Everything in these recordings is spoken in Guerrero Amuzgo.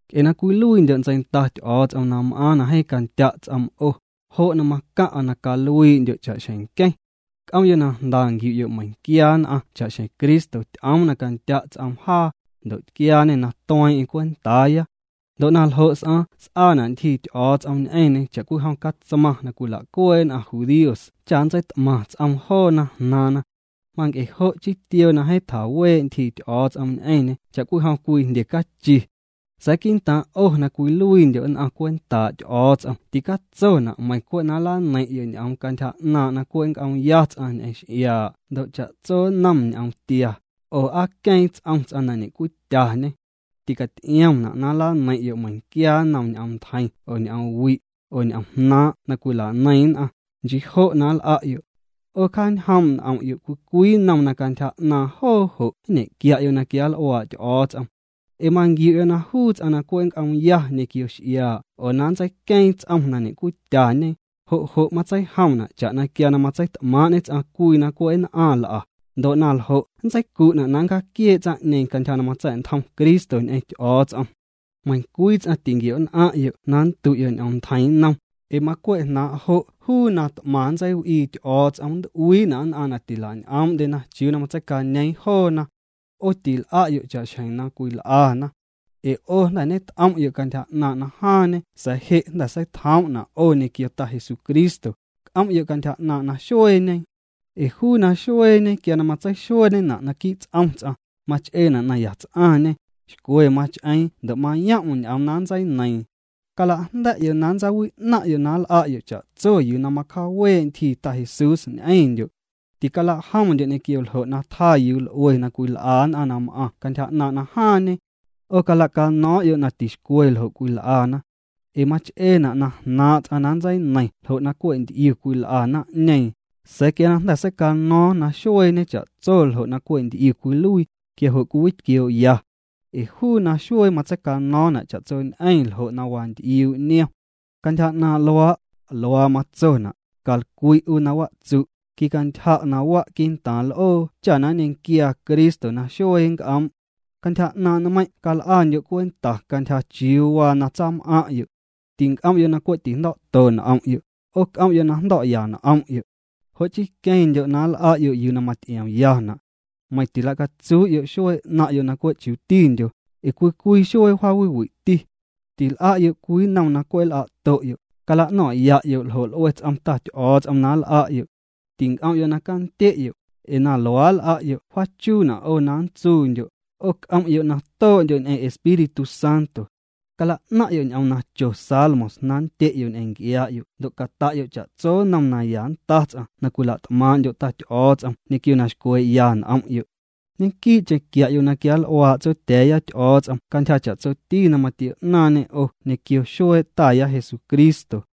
Nc'e na cwiluiindyo' ntseinda Ty'o̱o̱ts'om na m'aaⁿ na jeeⁿ candya' ts'oom 'o, jo' na macaⁿ'a na caluii'ndyo' cha'xjeⁿ nqueⁿ. C'om'yo' na jnda nquiu'yo' meiⁿquia nn'aⁿ cha'xjeⁿ Cristo ty'oom na candya' ts'oom jaa, ndo' tquiaañê na tueeⁿ'eⁿ cwentaaya. Ndo' na ljo' s'aaⁿ s'aana' ntyjii Ty'o̱o̱ts'om ñ'eⁿñê cha'cwijom catsmaⁿ na cwila'cuee' nn'aⁿ judíos cha nntseit'maⁿ ts'oom joona jnaaⁿna. Manc'e jo' chii tioo na jeeⁿ tjawee' ntyjii Ty'o̱o̱ts'om ñ'eⁿñê cha'cwijom cwii jndye cachi. Sa̱a̱ quii'ntaaⁿ' 'o na cwiluiindyo' nn'aⁿ cwentaa' Ty'o̱o̱ts'om ticatsona' meiⁿ cwe' na nlaneiⁿ'yo' ñ'oom cantyja 'naaⁿ' na cwe' nnc'oomya ts'aⁿ ñ'eⁿ x'iaa' ndo' cha'tso nnom ñ'oomtia, oo aa queeⁿ ts'om ts'aⁿ na ñe'cwityañê. Ticaty'iomna' na nlaneiⁿ'yo' meiⁿquia nnom ñ'oom ntjeiⁿ oo ñ'oom wi', oo ñ'omjnaaⁿ' na cwila'neiⁿ nn'aⁿ. Nchii jo' na nl'a'yo'. 'O cjaañjoom' n'om'yo' cwii cwii nnom na cantyja 'naaⁿ joo jo' nñe'quia'yo' na quianl'uaa' Ty'o̱o̱ts'om. Ee manquiu'yo' na juu ts'aⁿ na cwe' nnc'oomya ñequio x'iaa' oo na nntseiqueeⁿ ts'om na ñe'cwityañe, jo' jo' matseijomna' cha'na quia na matseit'maaⁿ'ñe ts'aⁿ cwii na cwe' nn'aⁿ nl'a, ndo' na ljo' nntseicu'na' na nncjaaquiee' tsaⁿ'ñeeⁿ cantyja na matsa̱'ntjom Cristo ñ'eⁿ Ty'o̱o̱ts'om. Meiⁿcwii ts'aⁿ tinquio'nn'aⁿ'yo' na nndu'yo' ñ'oom ntjeiⁿ nnom, ee macwe' jnaaⁿ' jo' juu na t'maⁿ nntseiw'ii Ty'o̱o̱ts'om nnt'uiina' nn'aⁿ na tilañ'oom'ndyena chiuu na matseicañeeⁿ joona. 'O til'a'yo' cha'xjeⁿ na cwil'ana. Ee 'o jnda̱ ñet'om'yo' cantyja 'naaⁿ' na jaaⁿñe sa̱a̱ je' na jnda̱ seitjoom'na' 'o ñequio Ta Jesucristo, c'om'yo' cantyja 'naaⁿ' naxueeñe, ee juu naxueeñe quia na matseixueeñena' naquii' ts'om ts'aⁿ, mach'eena' na yats'aⁿñê, xcwe mach'eeⁿ ndo' mayom'm ñ'oom na nntseineiiⁿ. Cala'jnda̱'yo' na nntsawi'naⁿ'yo' na nl'a'yo' cha'tso yuu na macjaawee' ntyjii Ta Jesús ñ'eⁿndyo'. Ticala'jomndyo' ñequio ljo' na tjaa yuu l'ue na cwil'a nn'aⁿ na m'aⁿ cantyja 'naaⁿ' na jaaⁿñe. 'O cala'cano̱o̱ⁿ'yo' na tixcwe ljo' cwil'ana. Ee mach'eena' na jnaaⁿ' ts'aⁿ na nntseineiⁿ ljo' na cwe' nty'iu cwil'a naⁿ'ñeeⁿ, sa̱a̱ quia na jnda̱ seicano̱o̱ⁿ naxueeñe cha'tso ljo' na cwe' nty'iu cwiluii, quia jo' cwiwitquioo'ya. Ee juu naxuee matseicano̱o̱ⁿna' cha'tsoñ'eⁿ ljo' na wanty'iuu' niom. Cantyja 'naaⁿ' luaa', luaa matsona': Calcwi' 'u na watsu', quicantyja' na wa' qui'ntaaⁿ l'oo cha na nñequiaa Cristo na xuee nnc'oom'. Cantyja 'naaⁿ' nmeiⁿ' cal'andyo' cwenta cantyja chiuu waa na tsam'aⁿ'yo'. Tinc'om'yo' na cwe' tijndo̱'to n'om'yo', 'o c'om'yo' na jndo̱'ya n'om'yo'. Jo' chii queⁿndyo' na nl'a'yo' yuu na maty'iomyana'. Meiⁿ tila'catsuu'yo' xuee 'naⁿ'yo' na cwe' chutindyo, ee cwii cwii xuee jaawiwi'ti. Til'a'yo' cwii nnom na cwe' nl'a'to'yo', cala'no̱ⁿ'ya'yo' ljo' l'ue ts'om Ta Ty'o̱o̱ts'om na nl'a'yo'. Tinc'om'yo' na candye'yo', ee na luaa' nl'a'yo' wjaachuna' 'o na nntsuundyo', 'o c'om'yo' na too'ndyo' ñ'eⁿ Espíritu Santo. Cala'naⁿ'yo' ñ'oom na cho salmos na nndye'yo' ñ'eⁿ nc'iaa'yo' ndo' cata'yo' cha'tso nnom na ya nnta ts'aⁿ na cwila't'maaⁿ'ndyo' Ta Ty'o̱o̱ts'om ñequio na xcwee'ya n'om'yo'. Ñequii'cheⁿ quia'yo' na quianl'uaa' Tsotya̱a̱ya Ty'o̱o̱ts'om cantyja cha'tsoti na matio'ñaaⁿñê 'o ñequio xuee' Taya Jesucristo.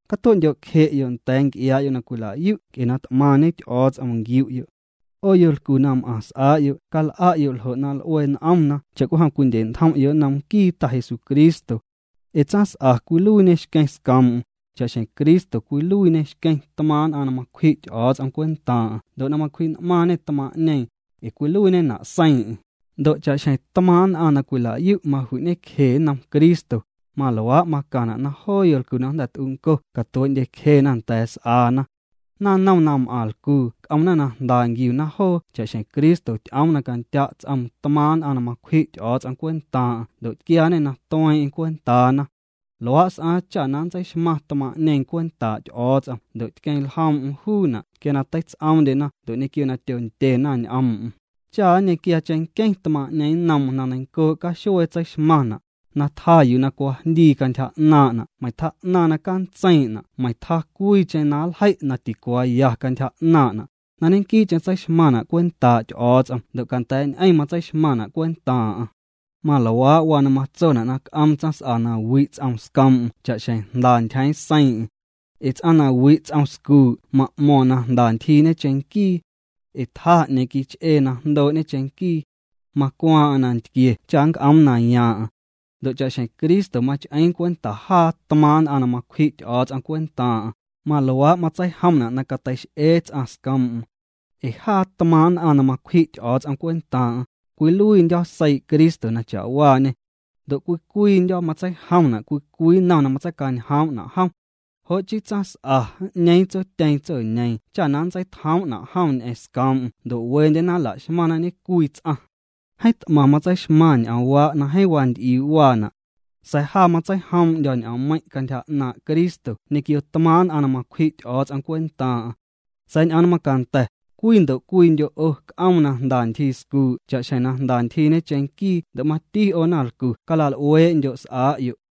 Catue'ndyo' cje'yo' nda̱a̱ nc'iaa'yo' na cwila'yu' nc'e na t'maⁿñe Ty'o̱o̱ts'om nquiu'yo'. 'O yolcu na m'aⁿ s'aa'yo' cal'a'yo' ljo' na l'ue n'omna cha'cwijom cwindye'ntjom'yo' nnom nquii Ta Jesucristo. Ee tsaⁿs'a cwiluiiñê xqueⁿ scoom'm, cha'xjeⁿ Cristo cwiluiiñê xqueⁿ tmaaⁿ' nn'aⁿ na macwji' Ty'o̱o̱ts'om cwentaaⁿ'aⁿ ndo' na macwji'n'maaⁿñê tmaaⁿ'ñeeⁿ, ee cwiluiiñena' seiiⁿ'eⁿ, ndo' cha'xjeⁿ t'maaⁿ' nn'aⁿ na cwila'yu' maju'ñecje nnom Cristo, maluaa' macaⁿna' na joo yolcu na jnda̱ t'unco catuee'ndyecjena nda̱a̱ s'aana. Naⁿnom na m'aⁿ lcuu c'omna na jnda nquiuna joo cha'xjeⁿ Cristo ty'oom na candya' ts'oom tmaaⁿ' nn'aⁿ na macwji' Ty'o̱o̱ts'om cwentaaⁿ'aⁿ ndo' na tquiaañê na tueeⁿ'eⁿ cwentaana. Luaa' s'aaⁿ cha na nntseixmaⁿ tmaaⁿ'ñeeⁿ cwentaa' Ty'o̱o̱ts'om ndo' tqueⁿ ljoom'm juuna' quia na teits'oomndyena ndo' ñequio na tyondyena ñ'oom'm, cha nñequiaa cheⁿnqueⁿ tmaaⁿ'ñeeⁿ nnoom na neiⁿncoo' caxuee tseixmaⁿna', na tjaa yuu na cwajndii cantyja 'naaⁿ'na' meiⁿ tjaa'naⁿ na cantseiiⁿ'na' meiⁿ tjaa cwiicheⁿ na nljei' na ticuaaya cantyja 'naaⁿ'na', na ñequii'cheⁿ tseixmaⁿna' cwentaa' Ty'o̱o̱ts'om ndo' canda̱a̱'ñ'eⁿ matseixmaⁿna' cwentaaⁿ'aⁿ. Maluaa' waa na matsona' na c'oom tsaⁿs'a na wi' ts'oom scoom'm cha'xjeⁿ jnda ntyjeeⁿ seiiⁿ'eⁿ. Ee ts'aⁿ na wi' ts'om scuu' ma'mo̱ⁿ na jnda ntyjiiñe cheⁿnquii. Ee tjaa 'ñeeⁿ quich'ee na jndoo'ñe cheⁿnquii. Macwaaⁿ'aⁿ nantquie cha nnc'oom na yaaⁿ'aⁿ. Ndo' cha'xjeⁿ Cristo mach'eeⁿ cwenta jaa tmaaⁿ' nn'aⁿ na macwji' Ty'o̱o̱ts'om cwentaaⁿ'aⁿ, maluaa' matseijomna' na cateix'ee ts'aⁿ scoom'm. Ee jaa tmaaⁿ' nn'aⁿ na macwji' Ty'o̱o̱ts'om cwentaaⁿ'aⁿ, cwiluiindyo̱ seii' Cristo na cha'waañê. Ndo' cwii cwiindyo̱ matseijomna' cwii cwii nnom na matseicañjoom'na' jom. “Jo' chii tsaⁿs'a n'ñeeⁿ tsotyeeⁿ tsoñeeⁿ cha na nntseitjoom'na' jom ñ'eⁿ scoom'm ndo' wendyena nla'xmaⁿna ñecwii ts'aⁿ.” Jeeⁿ t'maⁿ matseixmaⁿ ñ'oomwaa' na jeeⁿ wanty'iuu' waana'. Sa̱a̱ ja matseijoom'ndyo̱ ñ'oommeiⁿ' cantyja 'naaⁿ' Cristo ñequio tmaaⁿ' nn'aⁿ na macwji' Ty'o̱o̱ts'om cwentaaⁿ'aⁿ. Sa̱a̱ ñ'oom na macanda̱, cwii ndo' cwiindyo' 'o c'oom na jnda ntyjii scuu' cha'xjeⁿ na jnda ntyjiiñe cheⁿnquii ndo' mati 'o naⁿlcu cala'l'uee'ndyo' s'aa'yo'.